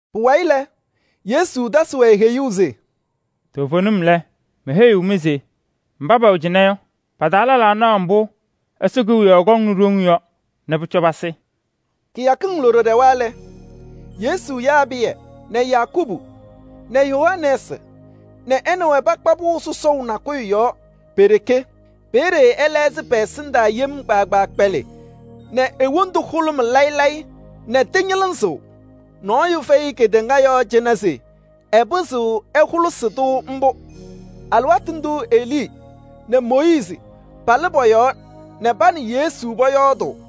Pʋwayɩ lɛ, Yesu tasɩ-wɛ heyuu se: “Toovenim lɛ, meheyiɣ-mɩ se mba pɛwɛ cɩnɛ yɔ, pa-taa lɛlaa naɣ ɛzɩma mbʋ Ɛsɔ Kewiyaɣ kɔŋnɩ ɖoŋ yɔ nɛ pʋcɔ pasɩ.” Kɩyakɩŋ loɖo ɖɛwa lɛ, Yesu yaa Pɩyɛ nɛ Yakubu nɛ Yohanɛɛsɩ nɛ ɛ nɛ wɛ pakpa pʋʋ sɔsɔʋ nakʋyʋ yɔɔ pe-ɖeke. Peeye ɛtɩlɛɣzɩ pɛ-ɛsɩndaa nɛ e-wondu hʋlʋmɩ layɩ layɩ nɛ tɩñɩlɩzɩɣ. Nɔɔyʋ fɛyɩ kedeŋa yɔɔ cɩnɛ se ɛpɩzɩɣ ɛhʋlɩsɩ-tʋ mbʋ. Alɩwaatʋ ndʋʋ Elii nɛ Mooyiizi palɩ pɔ-yɔɔ nɛ pa nɛ Yesu pɔyɔɔdʋʋ.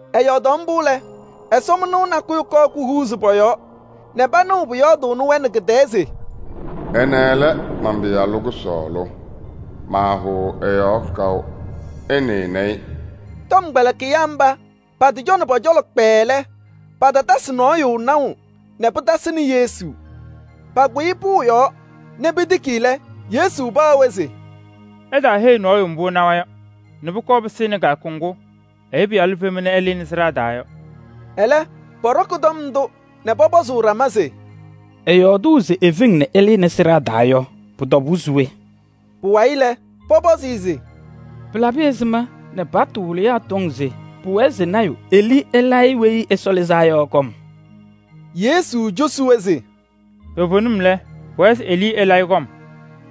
Ɛyɔɔdaɣ mbʋ lɛ, ɛsɔmɩnʋʋ nakʋyʋ kɔɔ kuhuuzi pɔ-yɔɔ nɛ panɩɩ pʋyɔɔdʋʋnɩ-wɛ nɛ kɩ-tɛɛ se: “Ɛnɛ lɛ man-Pɩyalʋ kʋsɔɔlʋ, maahʋʋ ɛ-yɔɔ kaʋ. Ɩnɩnɩ-ɩ.” Tɔmkpɛlɩkɩyaa mba patɩcɔnɩ pɔ-cɔlɔ kpɛɛɛ lɛ, patatasɩ nɔɔyʋ naʋ nɛ pɩtasɩnɩ Yesu. Pakʋyɩ pʋʋ yɔɔ nɛ petiki lɛ, Yesu paɣ-wɛ se: “Ɩtaaheyi nɔɔyʋ mbʋ ɩnawa yɔ nɛ pʋkɔɔ pɩsɩnɩ kɩyakʋ ŋgʋ Ɛyʋ Pɩyalʋ fema nɛ ɛlɩnɩ sɩɖaa taa yɔ.” Ɛlɛ pɔɖɔkɩ tɔm ndʋ nɛ pɔpɔzʋʋ ɖama se: “Ɛyɔɔdʋʋ se efeŋ nɛ ɛlɩnɩ sɩɖaa taa yɔ, pʋ-tɔbʋʋ se we?” Pʋwayɩ lɛ, pɔpɔzɩ-ɩ se: “Pɩlabɩ ɛzɩma nɛ paɣtʋ wɩlɩyaa tɔŋ se pʋwɛɛ se lɔɔyaɣ tʋ Elii ɛlayɩ Weyi Ɛsɔ Lɩzaa Yɔ kɔm?” Yesu cosi-wɛ se: “Toovenim, pʋwɛɛ se Elii ɛlayɩ kɔm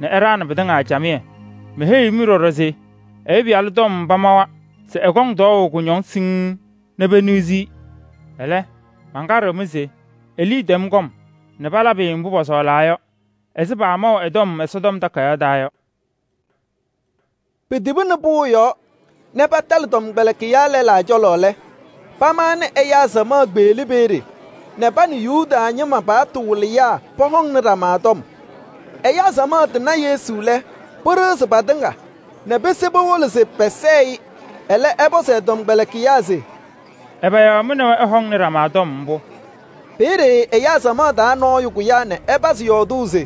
nɛ ɛɖaɣnɩ pɩtɩŋa camɩyɛ. Meheyiɣ-mɩ ɖɔɖɔ se Ɛyʋ Pɩyalʋ tɔm pamawa se ɛkɔŋ tɔɔʋ kʋñɔŋ siŋŋ nɛ peniɣzi-i. Ɛlɛ, mankaɖɩɣ-mɩ se Elii tɛm kɔm nɛ palabɩ-ɩ mbʋ pɔsɔɔlaa yɔ ɛzɩ paamaʋ ɛ-tɔm Ɛsɔtɔm Takayaɣ taa yɔ.” Petibini pʋʋ yɔɔ nɛ patalɩ tɔmkpɛlɩkɩyaa lɛlaa cɔlɔ lɛ, pamaɣnɩ ɛyaa samaɣ kpeɣli peeye nɛ pa nɛ Yuda ñɩma paɣtʋ wɩlɩyaa pɔhɔŋnɩ ɖama tɔm. Ɛyaa samaɣ tɩna Yesu lɛ, pɩɖɩɣzɩ patɩŋa nɛ pese powolo se pɛsɛɛ-ɩ. Ɛlɛ, ɛpɔzɩ ɛ-tɔmkpɛlɩkɩyaa se: “Ɛbɛ yɔɔ mɩ nɛ wɛ ɩhɔŋaɣnɩ ɖama tɔm mbʋ?” Peeye ɛyaa samaɣ taa nɔɔyʋ kʋyaa nɛ ɛpazɩ yɔɔdʋʋ se: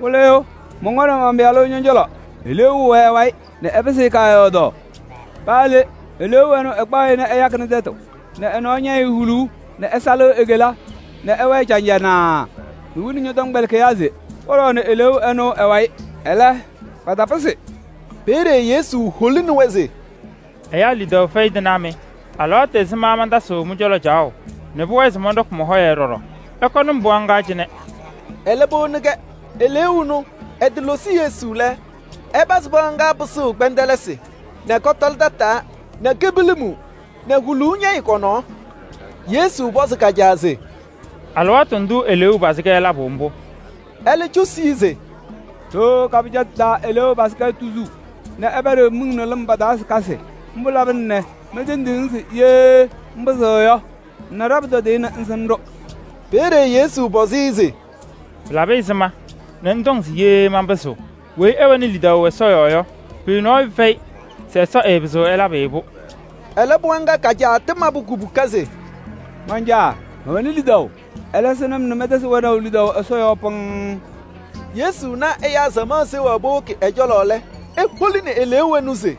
“Wɩlɩyʋ, mɔnkɔnɩ man-pɩyalʋ ñɔ-cɔlɔ, eleeu nɔɔyʋ wɛ ɛ-wayɩ nɛ ɛpɩsɩ-ɩ kaayɔɔdaɣ. Paa le, eleeu ɛnʋ ɛkpaɣ-ɩ nɛ ɛyakɩnɩ tɛtʋ nɛ ɛ-nɔɔ ñɛyɩɣ huluu nɛ ɛsalɩɣ e-kela nɛ ɛwɛɛ caŋjanaa. Mewini ñɔ-tɔmkpɛlɩkɩyaa se pɔɖɔɔnɩ eleeu ɛnʋ ɛ-wayɩ, ɛlɛ, patapɩzɩ.” Peeye Yesu holini-wɛ se: “Ɛyaa lidaʋ fɛyɩ tɩnaa mɩ! Alɩwaatʋ ɛzɩma mantasɩɣ mɩ-cɔlɔ caɣʋ nɛ pʋwɛɛ se mɔnɖɔkɩ mɔ-hɔyɛ ɖɔɖɔ? Ɩkɔnɩ-m pɩɣa ŋga cɩnɛ!” Ɛlɛ powoni-kɛ. Eleeu ɛnʋ ɛtɩlosi Yesu lɛ, ɛpazɩ pɩɣa ŋga pɩsʋʋ kpɛndɛlɩsɩ nɛ kɔtɔlɩ tataa nɛ kepilimi nɛ huluu ñɛyɩ kɔ-nɔɔ. Yesu pɔzɩ ka-caa se: “Alɩwaatʋ ndʋʋ eleeu pazɩ-kɛ labʋ mbʋ?” Ɛlɛ cosi-i se: “Ɖooo ka-pɩjatʋ taa eleeu pazɩ-kɛ tuzuu nɛ ɛpɛɖɩɣ miŋ nɛ lɩm pa-taa se kasɩ. Mbʋ labɩna nɛ mentendiɣ-ŋ se ye ŋpɩzɩɣ yɔ, ŋna ɖa-pʋtɔdɩyɛ nɛ ŋsɩnɩ-ɖʋ.” Peeye Yesu pɔzɩ-ɩ se: “Pɩlabɩ ɛzɩma nɛ ŋtɔŋ se ye manpɩzɩɣ? Weyi ɛwɛnɩ lidaʋ Ɛsɔ yɔɔ yɔ, pʋyʋ nɔɔyʋ fɛyɩ se Ɛsɔ ɛɛpɩzɩɣ ɛlabɩ-ɩ-pʋ.” Ɛlɛ pɩɣa ŋga ka-caa tɩmabʋ kubuka se: “Man-caa mɛwɛnɩ lidaʋ, ɛlɛ sɩnɩ-m nɛ mɛntɛzɩ wɛnaʋ lidaʋ Ɛsɔ yɔɔ pɩŋŋ.” Yesu na ɛyaa samaɣ seɣaɣ powoki ɛ-cɔlɔ lɛ, eholini eleeu ɛnʋ se: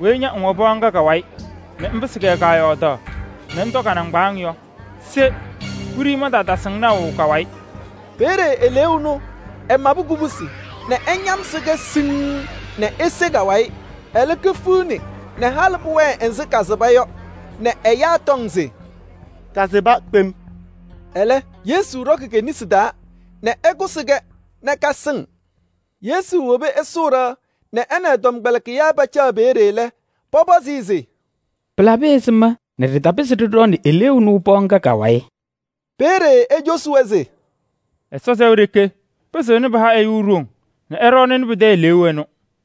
“Weyi ña ŋwɛ pɩɣa ŋga ka-wayɩ nɛ ŋpɩsɩ-kɛ kaayɔɔdaɣ nɛ ŋtɔ ka-nɩŋgbaaŋ taa yɔ, se! Wiɖiyi mantaatasɩ-ŋ naʋ ka-wayɩ.” Peeye eleeu ɛnʋ ɛmabɩ kubusi nɛ ɛñamsɩ-kɛ siŋŋ nɛ ese ka-wayɩ. Ɛlɛ kefiɣni nɛ halɩ pʋwɛɛ ɛzɩ kasɩba yɔ nɛ ɛyaa tɔŋ se: “Kasɩba kpem.” Ɛlɛ, Yesu ɖɔkɩ ke-nesi taa nɛ ɛkʋsɩ-kɛ nɛ kasɩŋ. Yesu wobi ɛsʋʋ ɖɩɣa nɛ ɛ nɛ ɛ-tɔmkpɛlɩkɩyaa pacaɣ pe-ɖeke lɛ, pɔpɔzɩ-ɩ se: “Pɩlabɩ ɛzɩma nɛ ɖɩtapɩzɩ ɖɩɖɔɔnɩ eleeu ɛnʋ pɩɣa ŋga ka-wayɩ?” Peeye ecosi-wɛ se: “Ɛsɔ sɛʋ ɖeke pɩzɩɣnɩ pɩha ɛyʋ ɖoŋ nɛ ɛɖɔɔnɩnɩ pɩtɛ eleeu ɛnʋ.”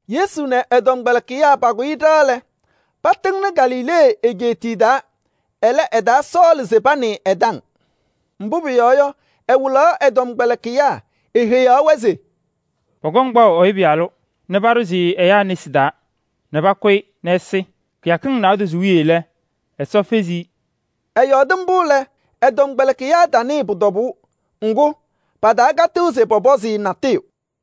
Yesu nɛ ɛ-tɔmkpɛlɩkɩyaa pakʋyɩ ɖɩɣa lɛ, patɩŋnɩ Galilee egeetiye taa. Ɛlɛ, ɛtaasɔɔlɩ se panɩɩ ɛ-taŋ. Mbʋ pʋyɔɔ yɔ, ɛwɩlaɣ ɛ-tɔmkpɛlɩkɩyaa. Eheyaɣ-wɛ se: “Pɔkɔŋ kpaʋ Ɛyʋ Pɩyalʋ nɛ paɖʋzɩ-ɩ ɛyaa nesi taa nɛ pakʋ-ɩ nɛ ɛsɩ. Kɩyakɩŋ naadozo wiye lɛ, Ɛsɔ fezi-i.” Ɛyɔɔdɩ mbʋ lɛ, ɛ-tɔmkpɛlɩkɩyaa tanɩɩ pʋ-tɔbʋʋ. Ŋgʋ, patakatɩɣ se pɔpɔzɩ-ɩ natʋyʋ.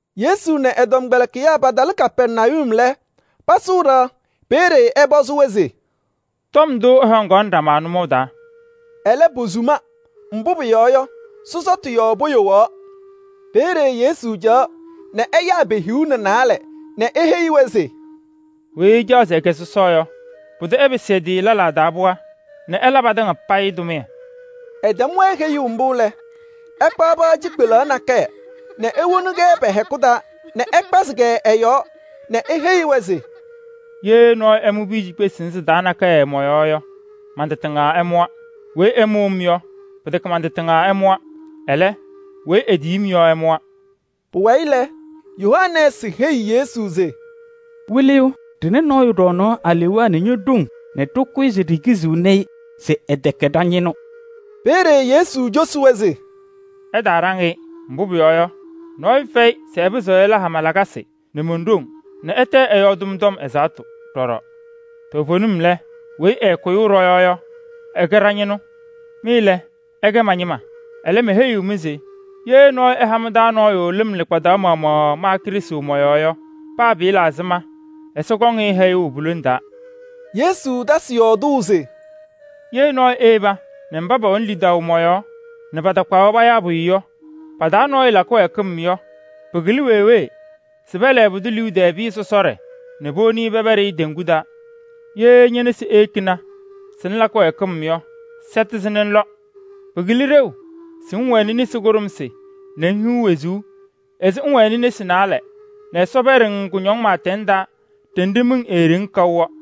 Yesu nɛ ɛ-tɔmkpɛlɩkɩyaa patalɩ Kapɛrnayum lɛ, pasʋʋ ɖɩɣa. Peeye ɛpɔzɩ-wɛ se: “Tɔm ndʋ ɩhɔŋaɣnɩ ɖama nʋmɔʋ taa?” Ɛlɛ, posuma, mbʋ pʋyɔɔ yɔ, sɔsɔtʋ yɔɔ poyowaɣ. Peeye Yesu caɣaɣ nɛ ɛyaa pe-hiu nɛ naalɛ nɛ eheyi-wɛ se: “Weyi ɛcaɣ se ɛkɛ sɔsɔ yɔ, pʋdʋ ɛpɩsɩ ɛ-tɩ lɛlaa taa pɩɣa nɛ ɛla patɩŋa payɩ tʋmɩyɛ.” Ɛtɛm-wɛ heyuu mbʋ lɛ, ɛkpaɣ pɩɣa cikpelaɣ nakɛyɛ nɛ ewoni-kɛ pɛ-hɛkʋ taa nɛ ɛkpazɩ-kɛ ɛ-yɔɔ nɛ eheyi-wɛ se: “Ye nɔɔyʋ ɛmʋ piya cikpesi sɩnɛ sɩ-taa nakɛyɛ mɔ-yɔɔ yɔ, man-tɩ tɩŋa ɛmʋwa. Weyi ɛmʋ-m yɔ, pɩtɛkɛ man-tɩ tɩŋa ɛmʋwa, ɛlɛ, weyi etiyi-m yɔ ɛmʋwa.” Pʋwayɩ lɛ, Yohanɛɛsɩ heyi Yesu se: “Wɩlɩyʋ, ɖɩna nɔɔyʋ ɖɔɔnaɣ alewaa nɛ ño-ɖoŋ nɛ ɖɩkʋyɩ se ɖikiziɣni-i se ɛtɛkɛ ɖa-ñɩnʋ.” Peeye Yesu cosi-wɛ se: “Ɩtaaɖaŋ-ɩ, mbʋ pʋyɔɔ yɔ, nɔɔyʋ fɛyɩ se ɛpɩzɩɣ ɛla hama lakasɩ nɛ mon-ɖoŋ nɛ ɛtɛ ɛyɔɔdɩ-m tɔm ɛzaɣtʋ peeye ɛnʋ. Toovenim lɛ, weyi ɛɛkʋyʋʋ ɖɔ-yɔɔ yɔ, ɛkɛ ɖa-ñɩnʋ. Mɩ lɛ, ɩkɛ ma-ñɩma. Ɛlɛ, meheyiɣ-mɩ se ye nɔɔyʋ ɛha mɩ-taa nɔɔyʋ lɩm lɩkpadaɣ maɣmaɣ ma Krɩstʋ mɔ-yɔɔ yɔ, paa pɩɩla ɛzɩma, Ɛsɔ kɔŋ-ɩ hɛyʋʋ pu-lone taa.” Yesu tasɩ yɔɔdʋʋ se: “Ye nɔɔyʋ eyeba nɛ mba pɛwɛnɩ lidaʋ mɔ-yɔɔ nɛ patakpaɣ-wɛ payaa pʋyʋ yɔ pa-taa nɔɔyʋ la kɩwɛɛkɩm yɔ, pɩkɩlɩ weewee se pɛlɛɛ e-liu tɛɛ pɩyɛ sɔsɔɖɛ nɛ powoni pɛpɛɖɩ teŋgu taa. Ye ñe-nesi eyekini se ŋla kɩwɛɛkɩm yɔ, sɛtɩ-sɩ nɛ ŋlɔ. Pɩkɩlɩ ɖeu se ŋwɛnɩ nesi kʋɖʋmsɩ nɛ ŋhiɣ wezuu ɛzɩ ŋŋwɛnɩ ñe-nesi naalɛ nɛ Ɛsɔ pɛɖɩ-ŋ kʋñɔŋ pɩɩtɛŋ taa ɖenɖe miŋ eeɖeŋ kaʋ yɔ. [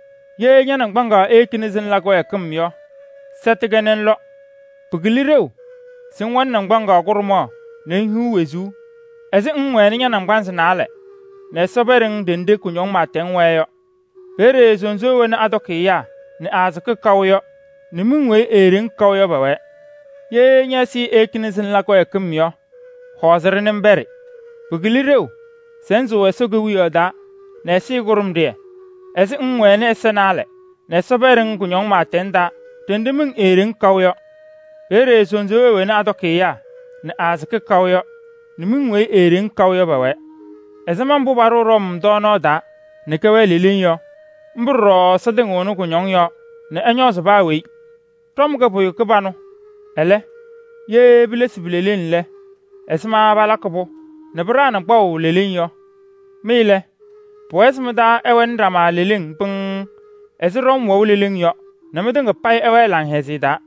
Ye ña-naŋgbaŋaɣ eyekini se ŋla kɩwɛɛkɩm yɔ, sɛtɩ-kɛ nɛ ŋlɔ. Pɩkɩlɩ ɖeu se ŋwɛnɩ naŋgbaŋaɣ kʋɖʋmaɣ nɛ ŋhiɣ wezuu ɛzɩ ŋŋwɛnɩ ña-naŋgbanzɩ naalɛ nɛ Ɛsɔ pɛɖɩ-ŋ ɖenɖe kʋñɔŋ pɩɩtɛŋ wɛɛ yɔ. [ Peeye ‘sunzuuwee wena atɔkɩ ɛyaa nɛ aasɩkɩ kaʋ yɔ nɛ miŋ weyi eeɖeŋ kaʋ yɔ pɛwɛɛ.’] Ye ñɛ-ɛzɩyɛ eyekini se ŋla kɩwɛɛkɩm yɔ, hɔɔzɩ-ɖɩ nɛ ŋpɛɖɩ. Pɩkɩlɩ ɖeu se ŋsʋʋ Ɛsɔ Kewiyaɣ taa nɛ ɛzɩyɛ kʋɖʋmɖɩyɛ ɛzɩ ŋŋwɛnɩ ɛza naalɛ nɛ Ɛsɔ pɛɖɩ-ŋ kʋñɔŋ pɩɩtɛŋ taa ɖenɖe miŋ eeɖeŋ kaʋ yɔ. Peeye ‘sunzuuwee wena atɔkɩ ɛyaa nɛ aasɩkɩ kaʋ yɔ nɛ miŋ weyi eeɖeŋ kaʋ yɔ pɛwɛɛ.’ “Ɛzɩma mbʋ paɖʋʋ ɖɔm tɔɔnaɣ taa nɛ kɛwɛɣ leleŋ yɔ, mbʋ ɖɔɖɔ Ɛsɔ tɩŋɩɣnɩ kʋñɔŋ yɔɔ nɛ ɛñɔɔzɩ paa weyi. “Ɖɔm kɛ pʋyʋ kɩbanʋ. Ɛlɛ, ye pilesi pi-leleŋ lɛ, ɛzɩma palakɩ-pʋ nɛ pɩɖaɣnɩ kpaʋ leleŋ yɔ? Mɩ lɛ, pʋwɛɛ se mɩ-taa ɛwɛnɩ ɖama leleŋ pɩŋŋ ɛzɩ ɖɔm wɛʋ leleŋ yɔ nɛ mɩtɩŋa payɩ ɩwɛɛ laŋhɛzɩyɛ taa.”